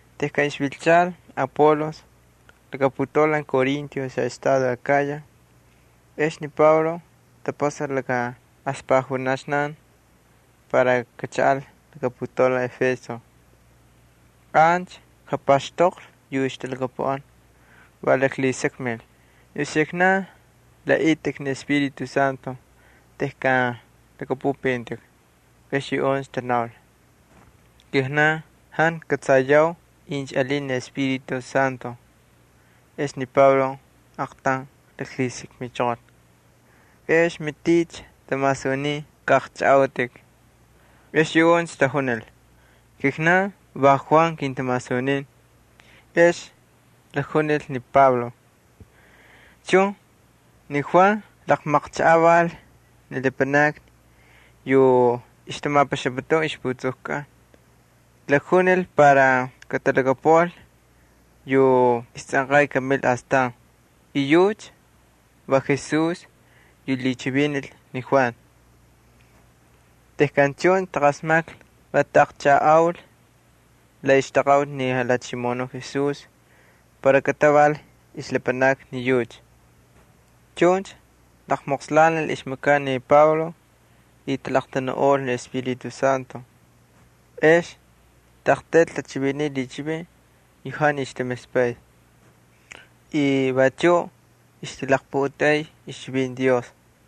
Tejkan ixvilchal Apolos laka putaulan Corinto xaꞌestado Akaya ex ni Pablo tapasal laka aspajunaxnan para kachaꞌal laka putaulan Éfeso. Ancha japaxtoqlhi yu ixtalhakapuꞌan. Va laklhisakmil: —¿Ni uxiknan laꞌaꞌitꞌik ni Espíritu Santo tejkan lhakꞌapꞌupꞌintꞌik? Ex yuꞌuncha tanaul: —Kijnan jantu kꞌatsayau incha alin ni Espíritu Santo. Ex ni Pablo aaqtaun laklhisakmichoqol: —¿Ex maticha tamasunin kaꞌaqchꞌajꞌautꞌik? Ex yuꞌuncha tajunil: —Kijnan va Juan kintamasunin. Ex lakjunil ni Pablo: —Chun, ni Juan laqmaqchajꞌaval ni lapanakni yu ixtamapaxaputun ixjatapastakꞌatkꞌan. Lakjunil para katalhakapuꞌal yu istsꞌanqay kamil astan. Yucha va Jesús yu lhichivinil ni Juan. Tejkan chuncha taqasmaklhi va taꞌaqchajꞌaul la ixtaqaꞌuti ni Jalhachimoꞌonuꞌ Jesús para kataval ixlapanakni ni yucha. Chuncha laqmoqslanil ixmakaꞌ ni Pablo y talaqtanuꞌol ni Espíritu Santo, ex taꞌaqtaylcha tachiviniy lhichivin yu jantu ixtamispay y vachuꞌ ixtalaqputeꞌey ixchivinti Dios.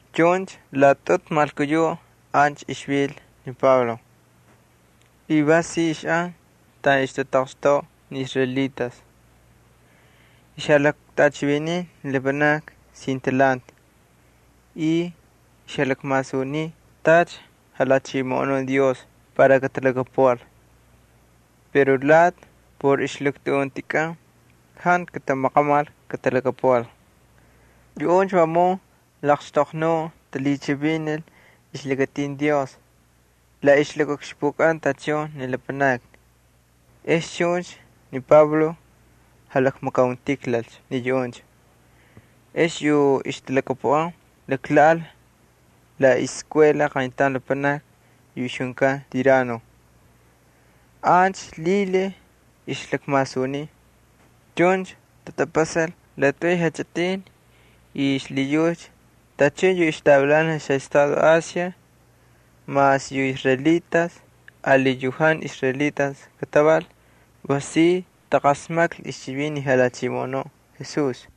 Chuncha laꞌatꞌutu malkuyuꞌ ancha ixvil ni Pablo, y va si ixꞌan taꞌan ixtataqxtoꞌa ni israelitas. Ixjalaktꞌachiviniy ni lapanakni sin talhanti y ixjalakmasuniy tacha lhachimoꞌonun Dios para katalhakapuꞌal. Pero lati por ixlaktuꞌuntikꞌan jantu katamaqamal katalhakapuꞌal. Yuꞌuncha vamun laqxtoqnuꞌ talhichivinil ixlakatin Dios la ixlakaꞌukxpukꞌan tachun ni lapanakni. Ex chuncha ni Pablo jalakmakauntijlalcha ni yuꞌuncha, ex yu ixtalhakapuꞌan laklhaꞌal la iskuela qayntaun lapanaki yu ixjunkan Tirano. Ancha lhilhiy ixlakmasuniy. Chuncha tatapasal laꞌatꞌuy jachꞌitin y xlhiyucha tachun yu ixtavilanal xaꞌestado Asia mas yu israelitas ali yu jantu israelitas kataval va si taqasmaklhi ixchivinti ni Jalhachimoꞌonuꞌ Jesús.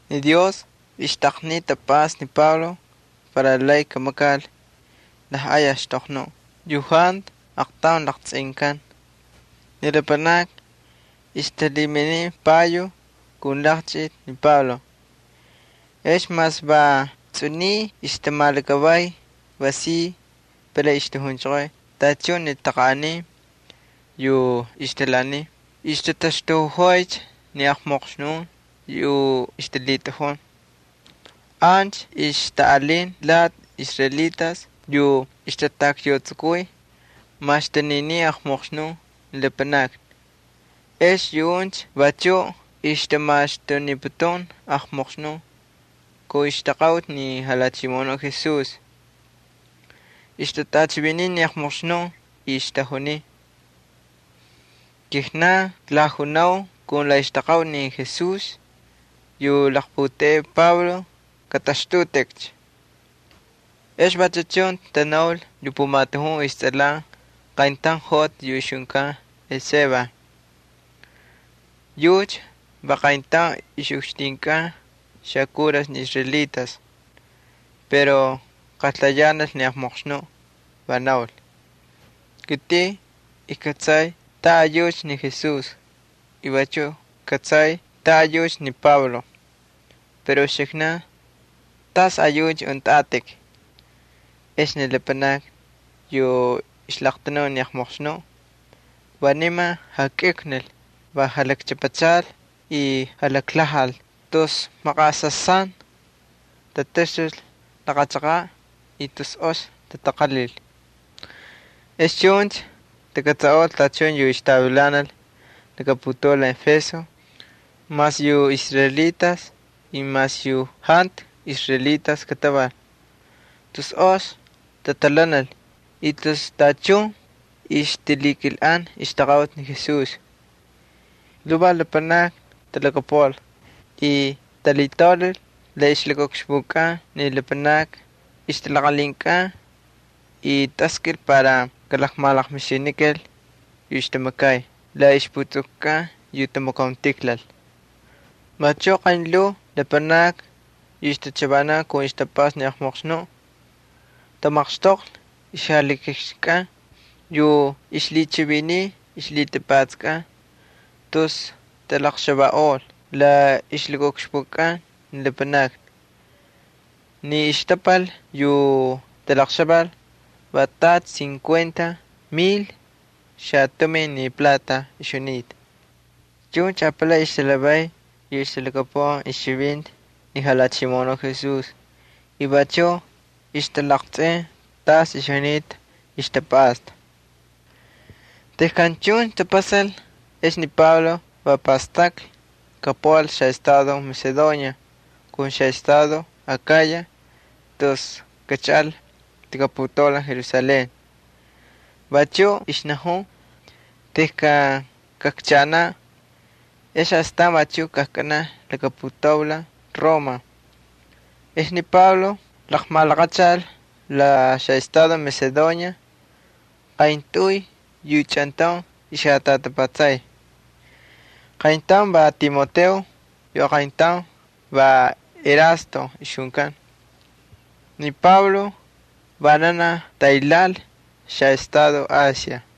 Ni Dios ixtaqniy tapꞌasta ni Pablo para lay kamakal lajꞌay axtoqnuꞌ yu jantu aqtaun laqtsꞌinkan. Ni lapanakni ixtalhiminiy payo kun laqchꞌiti ni Pablo. Ex mas va tsꞌuniy ixtamalakavay va si palay ixtajunchoqoy tachun ni taqanꞌanin yu ixtalhaaniy y ixtataxtuꞌojoycha ni jantu ox espíritus yu ixtalhitꞌajun. Ancha ixtaꞌalin lati israelitas yu ixtatakyautsukuy maxtuninin aqmoqxnun ni lapanakni. Ex yuꞌuncha vachuꞌ ixtamaxtuniputun aqmoqxnun kun ixtaqaꞌuti ni Jalhachimoꞌonuꞌ Jesús. Ixtatꞌachiviniy ni aqmoqxnun y ixtajuniy: —Kijnan klajunau kun la ixtaqaꞌuti ni Jesús yu laqputeꞌey Pablo, katꞌaxtꞌutꞌikcha. Ex vachu chun tanaul yu pumatujun istsꞌalan qayntaun joꞌati yu ixjunkan Esceva. Yucha va qayntaun ixꞌukxtinkꞌan xakuras ni israelitas. Pero qaltayanal ni jantu ox espíritu, va naul: —Kitꞌin ijkꞌatsay tasꞌayucha ni Jesús y vachuꞌ kꞌatsay tas ayucha ni Pablo. Pero yu uxiknan, ¿tasꞌayuꞌuncha untꞌatꞌik? Ex ni lapanaki yu ixlaqtanun ni jantu ox espíritu va niman jakꞌiuklnil va jalakchꞌapachal y jalaklhajal tus laqmaqaꞌasasan tataxtul laqa chaqaꞌ y tus ox tataqalhil. Ex chuncha takꞌatsaꞌol tachun yu ixtavilanal laka putaulan Éfeso mas yu israelitas y mas yu jantu israelitas kataval. Tus ox tatalhanal y tus tachun ay ixtamakay ixtaqaꞌuti ni Jesús. Lhuvaj lapanakni talhakapuꞌal y talhitaulal la ixlakaꞌukxpukꞌan ni lapanakni ixtalaqalhinkꞌan y taskꞌil para kalaqmalaqmixinikal yu ixtamakay la ixputsukukꞌan yu tamakauntijlal. Vachuꞌ qaynlhuu lapanakni yu ixtachavanan tamaqxtoqlhi ixjalhikixkꞌan yu ixlhichiviniy ixlhitapatskꞌan, tus talaqxavaꞌol la ixlakaꞌukxpukꞌan ni lapanakni. Ni xtapal yu talaqxaval va tacha cincuenta mil xatumin plata ixjunita. Chuncha apalay ixtalhavay yu ixtalhakapuꞌan ixchivinti ni Jalhachimoꞌonuꞌ Jesús y vachuꞌ ixtalaqtsꞌin tas ixjunita ixtapꞌasta. Tejkan chuncha tapasal ex ni Pablo va pastaklhi kapuꞌal xaꞌestado Macedonia kun xaꞌestado Akaya tus kachaꞌal laka putaulan Jerusalén. Vachuꞌ ixnajun: —Tejkan kakchaꞌanaꞌ ex astan vachuꞌ kajkꞌanaꞌ laka putaulan Roma. Ex ni Pablo laqmalaqachal la xaꞌestado Macedonia qayntꞌuy yu chꞌantaun ixjatꞌatapatsay. Qayntaun va Timoteo, yu aqayntaun va Erasto ixjunkan. Ni Pablo vananaj taylhaanil xaꞌestado Asia.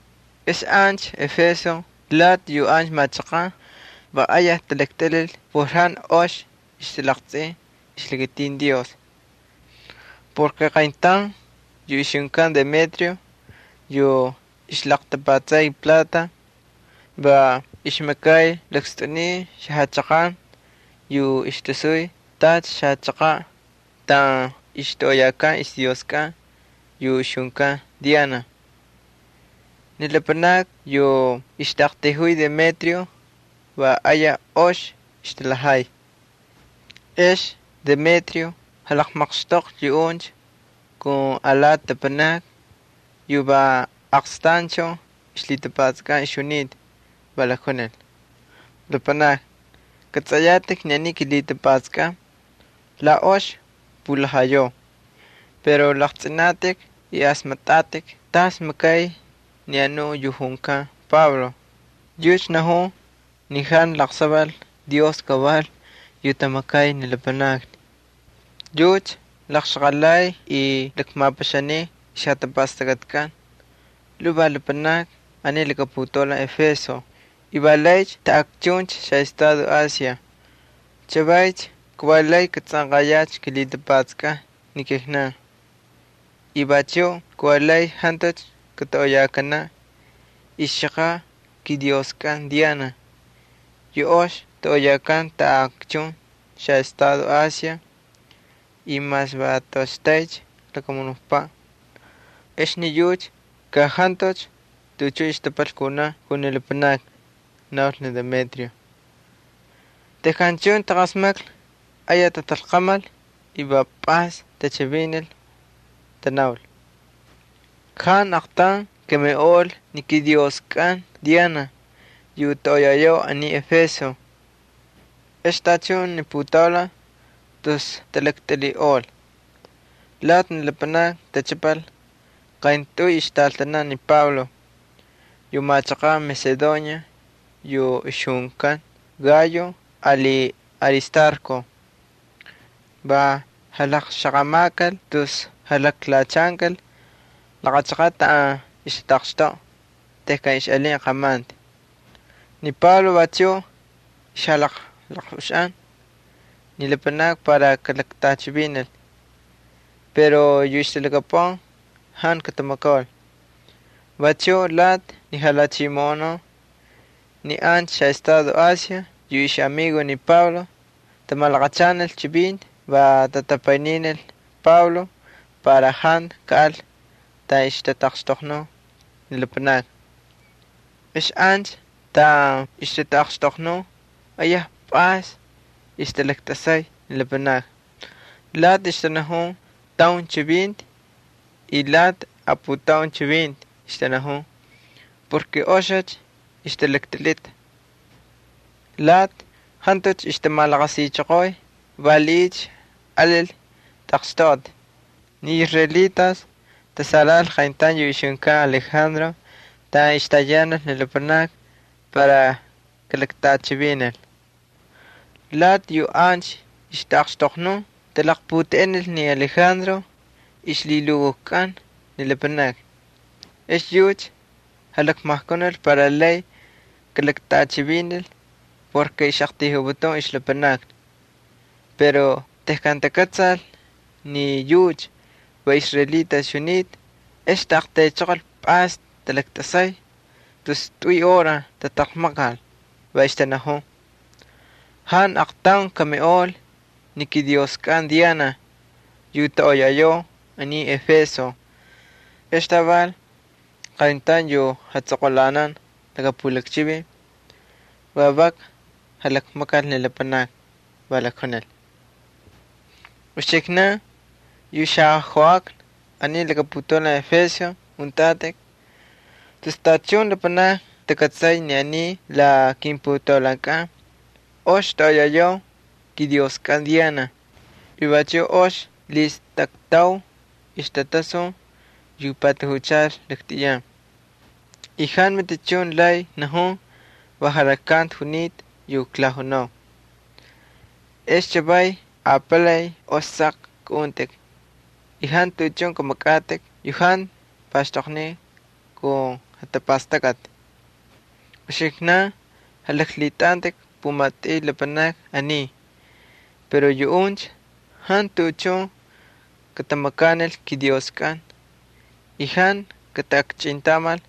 Ex ancha Éfeso lati yu ancha machaqan va ayaj talaktꞌilhil por jantu ox ixtalaqtsꞌin ixlakatin Dios. Qayntaun yu ixjunkan Demetrio yu ixlaqltapatsay plata, va ixmakay lakstꞌuniy xajachaqan yu ixtasuy tacha xachaqaꞌ taꞌan ixtoꞌoyakan ixdioskꞌan yu ixjunkan Diana. Ni lapanakni yu ixtaꞌaqtayjuy Demetrio va ayaj ox ixtalhajay. Ex yu Demetrio jalaqmaqxtoqlhi yuꞌuncha kun alati lapanakni yu va aqstanchun ixlhitapatskꞌan ixjunita, va lakjunil: —Lapanakni, kꞌatsꞌayatꞌik ni aniy kilhitapatskꞌan la ox pulhajayau. Pero laqtsꞌinatꞌik y asmaktꞌatꞌik tacha makay ni anuꞌ yu junkan Pablo. Yucha najun ni jantu laqsaval dios kaval yu tamakay ni lapanakni. Yucha laqxaqalay y lakmapaxaniy ixjatapastakꞌatkꞌan lhuvaj lapanakni aniy laka putaulan Éfeso y va laycha taꞌakchuncha xaꞌestado Asia. Chavaycha kavalay katsꞌanqayacha kilhitapatsakꞌan ni kijnan y vachuꞌ kavalay jantucha katoꞌoyakanaꞌ ixchaqaꞌ kidioskꞌan Diana yu ox toꞌoyakan taꞌakchun xaꞌestado Asia y mas va toꞌoxtaycha lakamunukpaꞌ, ex ni yucha ka jantucha tuꞌuchun xtapal kunaꞌ kun ni lapanakni —naul ni Demetrio. Tejkan chuncha taqasmaklhi ayaj tatalqamal, va pꞌays tachivinil, va tanaul: —Jantu aqtaun kamiꞌol ni kidioskꞌan Diana yu toꞌoyayau aniy Éfeso. Ex tachun ni putaulan tus tatalaktꞌilhiꞌol. Lati ni lapanakni tachꞌapal qayntꞌuy ixtꞌaltanan ni Pablo yu machaqan Macedonia yu ixjunkan Gayo ali Aristarco. Va jalaqxaqamakal tus jalaklhachankal laqa chaqaꞌ taꞌan ixtataqxtoꞌa tejkan ixꞌalin qamanti. Ni Pablo vachuꞌ ixjalaqꞌuxaꞌan ni lapanakni para kalaktꞌachivinil pero yu ixtalhakapuꞌan jantu katamakaul. Vachuꞌ lati ni jalhachimoꞌonun ni ancha xaꞌestado Asia yu ixꞌamigos ni Pablo tamalaqachanil chivinti va tatapayninil ni Pablo para jantu kaꞌal taꞌan ixtaꞌaqxtoqnun ni lapanakni. Ex ancha taꞌan ixtaꞌaqxtoqnun ayaj pꞌays ixtatꞌasay ni lapanakni. Lati ixtanajun taun chivinti, y lati aputaun chivinti ixtanajun porke oxicha ixtatalaktꞌilhita. Lati jantucha ixtamalaqasichoqoy valiꞌiycha alil taqxtoꞌati. Ni israelitas tasalhaꞌal qayntaun yu ixjunkan Alejandro taꞌan ixtayanal ni lapanakni para kalaktꞌachivinil. Lati yu ancha ixtaꞌaqxtoqnun talaqputeꞌenil ni Alejandro ixlhilukujkꞌan ni lapanakni. Ex yucha jalakmajkunil para lay kalaktꞌachivinil porke ixꞌaqtayjuputun ixlapanakni. Pero tejkan takꞌatsal ni yucha va israelita ixjunita, ex taꞌaqtaychoqol pꞌays talaktꞌasay tus tꞌuy hora tataqmaqal, va ixtanajun: —¡Jantu aqtaun kamiꞌol ni kidioskꞌan Diana, yu toꞌoyayau aniy Éfeso! Ex taval, qayntaun yu jatsꞌoqꞌulanan laka pulakchivin va vak jalakmakal ni lapanakni, va jalakjunil: —Uxiknan, yu xajoꞌakna aniy laka putaulan Éfeso untꞌatꞌik, tus tachun lapanakni takꞌatsay ni aniy la kimputaulankꞌan ox toꞌoyayau kidioskꞌan Diana y vachuꞌ ox lhistaktau ixtꞌatasun yu patajuchal laktꞌiyan. Jantu matichun lay najun va jalaklkanti junita yu klajunau. Ex chavaycha apalay ox saqcha kꞌaꞌuntꞌik y jantu tuꞌuchun kamakꞌatꞌik yu jantu paxtoqniy kun jatapastakꞌati. Uxiknan jalaklhitꞌantꞌik pumatꞌuy lapanakni aniy, pero yuꞌuncha jantu tuꞌuchun katamakanil kidioskꞌan y jantu kataꞌakchꞌintamal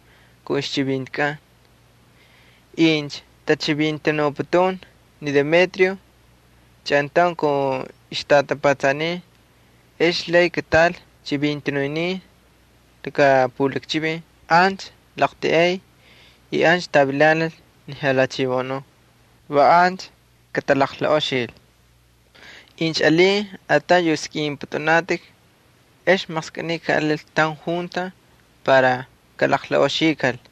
kun ixchivintikꞌan. Incha tachivintanuputun ni Demetrio chꞌantaun kun ixtꞌatapatsanin ex lay kataꞌal chivintanunin laka pulakchivin ancha laqltiꞌay y ancha tavilanal ni jalhachimoꞌonun. Va ancha katalaqlaꞌoxil. Incha alin ataun yu skꞌinpꞌutꞌunatꞌik, ex maqskꞌiniy kaꞌalil taun junta para kalaqlaꞌoxikal.